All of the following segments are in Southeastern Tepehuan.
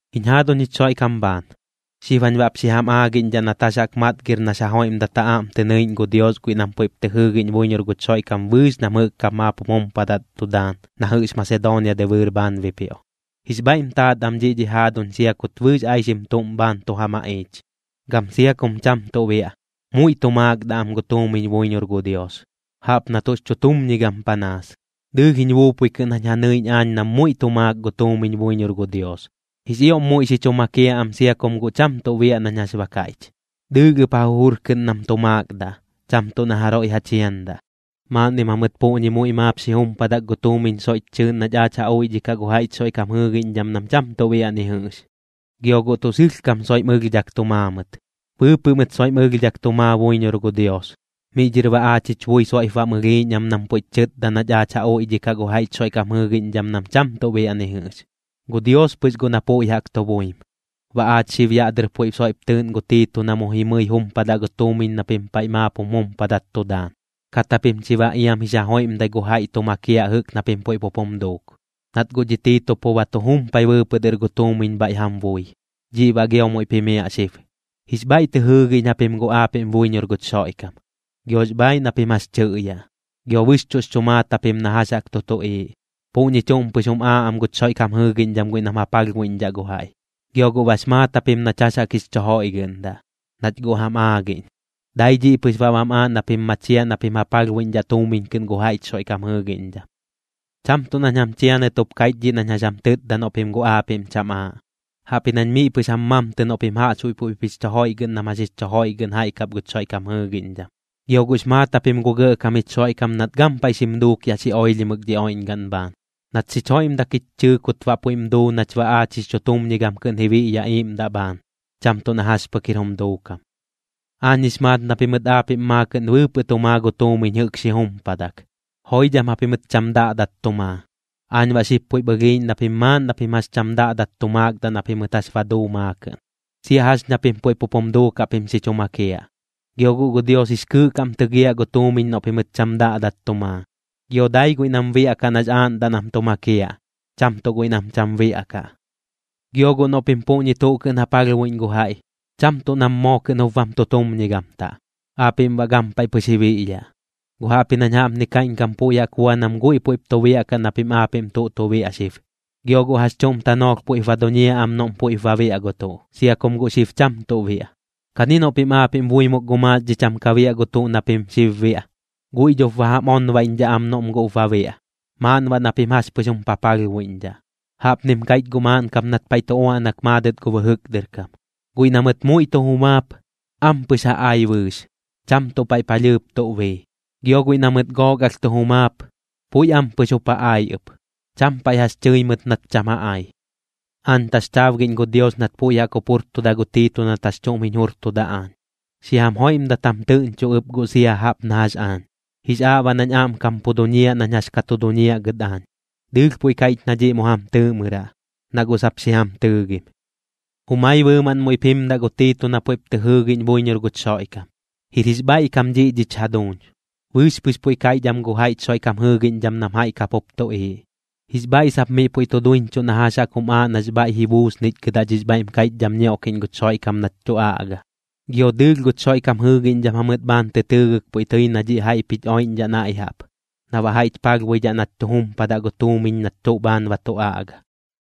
Jiñ jaaduñ jich Xoiꞌkam bhaan, xib jañ baꞌp xi jam aagiꞌñdhaꞌ nat jax jaꞌk matgir nax ja joiꞌmdat ja aꞌm tɨ nɨiꞌñ gu Dios guiꞌ nam puiꞌp tɨ jɨɨgiꞌñ buiñor guch Xoiꞌkam bɨɨx nam jɨꞌk kap maap jum jumpadat tu daan na jɨꞌx Masedoonia dɨbɨɨr bhaan bipioꞌ. Jix bhaiꞌm taat am dhiꞌ dhich jaaduñ sia kut bɨɨx aixim tuꞌm bhaan tu ja maꞌiich. Gam sia kum cham tuꞌ biaꞌ, muiꞌ tu maakdaꞌ am gu tuumiñ buiñor gu Dios, jaꞌp na tuꞌx chutumñigam panaas. Dɨɨlh jiñ buupui kɨꞌn jañ ja nɨiꞌñ aañ nam muiꞌ tu maak gu tuumiñ buiñor gu Dios, jix ioꞌm muiꞌ xi chu makiaꞌ am sia kum guꞌ cham tuꞌ biaꞌ nañ jax ba kaiꞌch. Dɨɨlh ɨp ja jujur kɨꞌn nam tu maakdaꞌ, cham tuꞌ na jaroiꞌ ja chiandaꞌ. Maaꞌnnim jamɨt puꞌñi muiꞌ maap xi jumpadak gu tuumiñ soiꞌch chɨɨꞌn nach aach ja uiꞌdhikaꞌ gu jaiꞌch Xoiꞌkam jɨɨgiꞌñdham nam cham tuꞌ biaꞌ ni jɨꞌx. Gio guꞌ tuꞌ sɨlhkam soiꞌm ɨlhdhak tu maa mɨt. Bɨɨpɨꞌ mɨt soiꞌm ɨlhdhak tu maa buiñor gu Dios, miꞌ dhɨr baꞌ aach jich bui soiꞌp bam ɨlhiiꞌñ am nam puiꞌch chɨtda nach ja uiꞌdhikaꞌ gu jaiꞌch Xoiꞌkam jɨɨgiꞌñdham nam cham tuꞌ biaꞌ ni jɨꞌx. Gu Dios pɨx guꞌ na puiꞌ jaꞌk tu buim. Baꞌ aach xib yaꞌ dɨr puiꞌ soiꞌp tɨɨꞌn gu Tiito na mu jimɨi jumpadaꞌ gu tuumiñ na pim paiꞌ maap jum jumpadat tu daan, kat japim chi baꞌ iam jix ja joiꞌmdai gu jaiꞌ tu makiaꞌ jɨꞌk na pim puiꞌ pup jum duuk. Nat guꞌ dhi Tiito pu ba tu jumpai bɨɨpɨꞌ dɨr gu tuumiñ bhaiꞌ jam bui, dhiꞌ baꞌ gio muiꞌp jimiaꞌ xib. Jix bhaiꞌ tɨ jɨɨgiꞌñ japim guꞌ aapiꞌm buiñor guch Xoiꞌkam, giox bhaaiꞌ na pim jax chɨꞌyaꞌ, gio bɨxchuꞌx chu maat japim na jax jaꞌk tu tuꞌiiꞌ. Puꞌñi chuꞌm pɨx jum aaꞌ am guch Xoiꞌkam jɨɨgiꞌñdham guiꞌ nam ja palhbuiꞌñdhaꞌ gu jaiꞌ. Gio guꞌ bax maat japim nach jax jaꞌk jix chu joiꞌgɨꞌndaꞌ, nach guꞌ jam aagiꞌñ. Dai dhiꞌ pɨx baꞌ bam aaꞌ na pim machiaꞌ na pim ja palhbuiꞌñdhaꞌ tuumiñ kɨꞌn gu jaiꞌch Xoiꞌkam jɨɨgiꞌñdham. Cham tuꞌ nañ jam chianɨt jup kaiꞌch dhiꞌ nañ jax jam tɨtda noꞌ pim guꞌ aapiꞌm cham aaꞌ, jaꞌpji nañ miꞌ pɨx jam mamtɨ noꞌ pim jaꞌxbuiꞌ puiꞌp jix chu joiꞌgɨꞌn nam jax jix chu joiꞌgɨꞌn jaiꞌ kap guch Xoiꞌkam jɨɨgiꞌñdham. Gio guꞌx maat japim gu Gɇꞌkam jich Xoiꞌkam nat gampaiꞌ xim duuk yaꞌ xi oilhimɨk dhi oiꞌñgaꞌn bhaan. Nat xich joiꞌmdak jich chɨɨ kut baꞌ puiꞌm duu nach baꞌ aach jix chutumñigam kɨꞌn ji biꞌyaꞌ iiꞌmdaꞌ bhaan, cham tuꞌ na jax pɨk jir jum duukam. Aañ jix maat na pimɨt aapiꞌm maakɨꞌn bɨɨpɨꞌ tu maa gu tuumiñ jɨꞌk maap xi jumpadak, joidham japimɨt cham daꞌdat tu maa. Aañ baꞌ xib puiꞌp ɨlhiiꞌñ na pim maaꞌn na pim jax cham daꞌdat tu maakdaꞌ na pimɨt jax ba duu maakɨꞌn, sia jax ña pim puiꞌ pup jum duukaꞌ pim xi chu makiaꞌ. Gio guꞌ gu Dios jix kɨɨꞌ kam tɨgiaꞌ gu tuumiñ noꞌ pimɨt cham daꞌdat tu maa, gio dai guiꞌ nam biaꞌkaꞌ nax aaꞌndaꞌ nam tu makiaꞌ, cham tuꞌ guiꞌ nam cham biaꞌkaꞌ. Gio guꞌ noꞌ pim puꞌñi tuꞌ kɨꞌn ja palhbuiꞌñ gu jaiꞌ, cham tuꞌ nam moo kɨꞌn jup bam tutumñigamtaꞌ, aapiꞌm baꞌ gampaiꞌ pɨx ji biꞌyaꞌ, guꞌ jaꞌpji nañ jaꞌpni kaiꞌñkam puiꞌ jaꞌk bua nam guiꞌ puiꞌp tu biaꞌkaꞌ na pim aapiꞌm tuꞌ tu biaꞌ xib. Gio guꞌ jax chuꞌm tanoolh puiꞌp ba duñiaꞌ am noꞌm puiꞌp ba biaꞌ gu tuꞌ, sia kum guꞌ xib cham tuꞌ biaꞌ. Kani noꞌ pim aapiꞌm buimok gu maaxdhiꞌ cham ka biaꞌ gu tuꞌ na pim xib biaꞌ, guiꞌ dhop ba jam onbaiꞌñdhaꞌ am noꞌm guꞌp ba biaꞌ, maaꞌn baꞌ na pim jax pɨx jum papalhbuiꞌñdhaꞌ. Jaꞌpnim kaiꞌch guꞌ maaꞌn kap nat paiꞌ tu uaꞌnak maadɨt gu bɨjɨk dɨr kam: “Guiꞌ na mɨt muiꞌ tu jumaap, ampɨx ja ai bɨɨx, cham tuꞌ paiꞌ palhɨɨp tuꞌ bii. Gio guiꞌ na mɨt gook alh tu jumaap, puiꞌ ampɨx jup ja ai ɨp, cham paiꞌ jax tɨi mɨt nat cham ja ai.” Aañ taxchaabgiꞌñ gu Dios nat puiꞌ jaꞌk jup jurtuda gu Tiito nat jax chuꞌm jiñ jurtuda aañ, xi jam joiꞌmdat jam tɨꞌñcho ɨp guꞌ sia jaꞌp na jax aañ. Jix aaꞌ baꞌ nañ aꞌmkam pu duñiaꞌ nañ jax ka tu duñiaꞌ gɨt aañ, dɨɨlh puiꞌ kaiꞌch na dhiꞌ mu jam tɨɨꞌmɨraꞌ, na guꞌ sap xi jam tɨɨgim. Jumai bɨɨmaꞌn muiꞌp jimdaꞌ gu Tiito na puiꞌp tɨ jɨɨgiꞌñ buiñor guch Xoiꞌkam. Jir jix bhaiꞌkam dhiꞌ dhich jaduuñ, bɨɨx pɨx puiꞌ kaiꞌch am gu jaiꞌch Xoiꞌkam jɨɨgiꞌñdham nam jaiꞌ kap jup tuꞌiiꞌ. Jix bhaiꞌ sap miꞌ puiꞌ tu duiñchuꞌ na jax jaꞌk jum aaꞌ na baꞌx bhaiꞌ ji buusnichgɨdaꞌ dhix bhaiꞌm kaiꞌchdam ñioꞌkiꞌñ guch Xoiꞌkam nach tu aꞌga. Gio dɨɨlh guch Xoiꞌkam jɨɨgiꞌñdham jamɨt bhaan tɨ tɨɨgɨk puiꞌ tɨi na dhiꞌ jaiꞌp jich oiꞌñdhaꞌ naiꞌ jaꞌp, na baꞌ jaiꞌch palhbuidhidhaꞌ nach tu jumpadaꞌ gu tuumiñ nach tuꞌ bhaan ba tu aꞌga.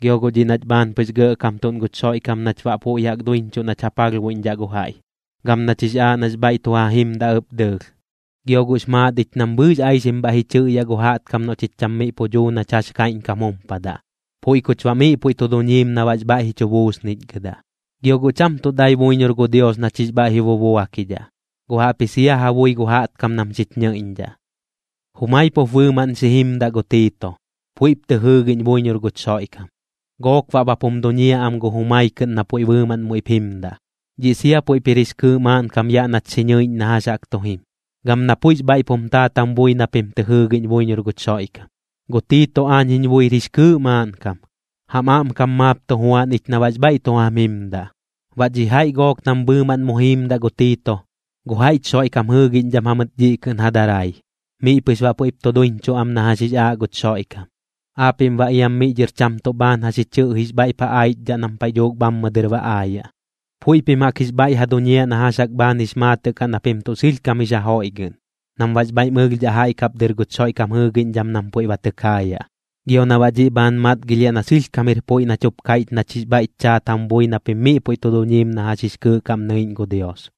Gio guꞌ dhiꞌ nach bhaan pɨx gɇꞌkamtuꞌn guch Xoiꞌkam nach baꞌ puiꞌ jaꞌk duiñchuꞌ nach ja palhbuidhaꞌ gu jaiꞌ, gam nach jix aaꞌ nax bhaiꞌ tu ja jimdaꞌ ɨp dɨɨlh. Gio guꞌx maat ich nam bɨɨx aixim bhaiꞌ ji chɨꞌyaꞌ gu jaꞌtkam noꞌ chich cham miꞌ pu duu nach jax kaiꞌñkam jumpadaꞌ, puiꞌ kuch baꞌ miꞌ puiꞌ tu duñiim na baꞌx bhaiꞌ ji chu buusnichgɨdaꞌ. Gio guꞌ cham tuꞌ dai buiñor gu Dios nach jix bhaiꞌ ji bubuakidhaꞌ, guꞌ jaꞌpji sia ja bui gu jaꞌtkam nam xich ñɨiꞌñdhaꞌ. Jumai pup bɨɨmaꞌn xi jimdaꞌ gu Tiito, puiꞌp tɨ jɨɨgiꞌñ buiñor guch Xoiꞌkam, gook baꞌ bap jum duñiaꞌ am gu jumai kɨꞌn na puiꞌ bɨɨmaꞌn muiꞌp jimdaꞌ. Dhiꞌ sia puiꞌp jir jix kɨɨꞌ maaꞌnkam yaꞌ nach xi ñɨiꞌñ na jax jaꞌk tu jim, gam na puiꞌx bhaiꞌp jum taat jam bui na pim tɨ jɨɨgiꞌñ buiñor guch Xoiꞌkam. Gu Tiito aañ jiñ buir jix kɨɨꞌ maaꞌnkam, jam aꞌmkam maap tu juan ich na baꞌx bhaiꞌ tu jam jimdaꞌ. Baꞌ dhi jaiꞌ gook nam bɨɨmaꞌn mu jiimdaꞌ gu Tiito, gu jaiꞌch Xoiꞌkam jɨɨgiꞌñdham jamɨt dhiꞌ kɨꞌn ja darai, miꞌ pɨx baꞌ puiꞌp tu duiñchuꞌ am na jax jix aaꞌ guch Xoiꞌkam. Aapiꞌm baꞌ iam miꞌ dhɨr cham tuꞌ bhaan jax ji chɨꞌjix bhaiꞌp ja aichdhaꞌ nam paiꞌ dhuuk bhammɨ dɨr ba aayaꞌ. Puiꞌ pim jaꞌk jix bhaiꞌ ja duñiaꞌ na jax jaꞌk bhaan jix maatɨꞌ kaꞌ na pim tuꞌ sɨlhkam jix ja joiꞌgɨꞌn, nam baꞌx bhaiꞌm ɨlhdhaꞌ jaiꞌ kap dɨr guch Xoiꞌkam jɨɨgiꞌñdham nam puiꞌ ba tɨ kaayaꞌ, gio na baꞌ dhiꞌ bhaan matgilhiaꞌ na sɨlhkam jir puiꞌ nach jup kaiꞌch nach jix bhaiꞌch chaat jam bui na pim miꞌ puiꞌ tu duñiim na jax jix kɨɨꞌ kaꞌm nɨiꞌñ gu Dios.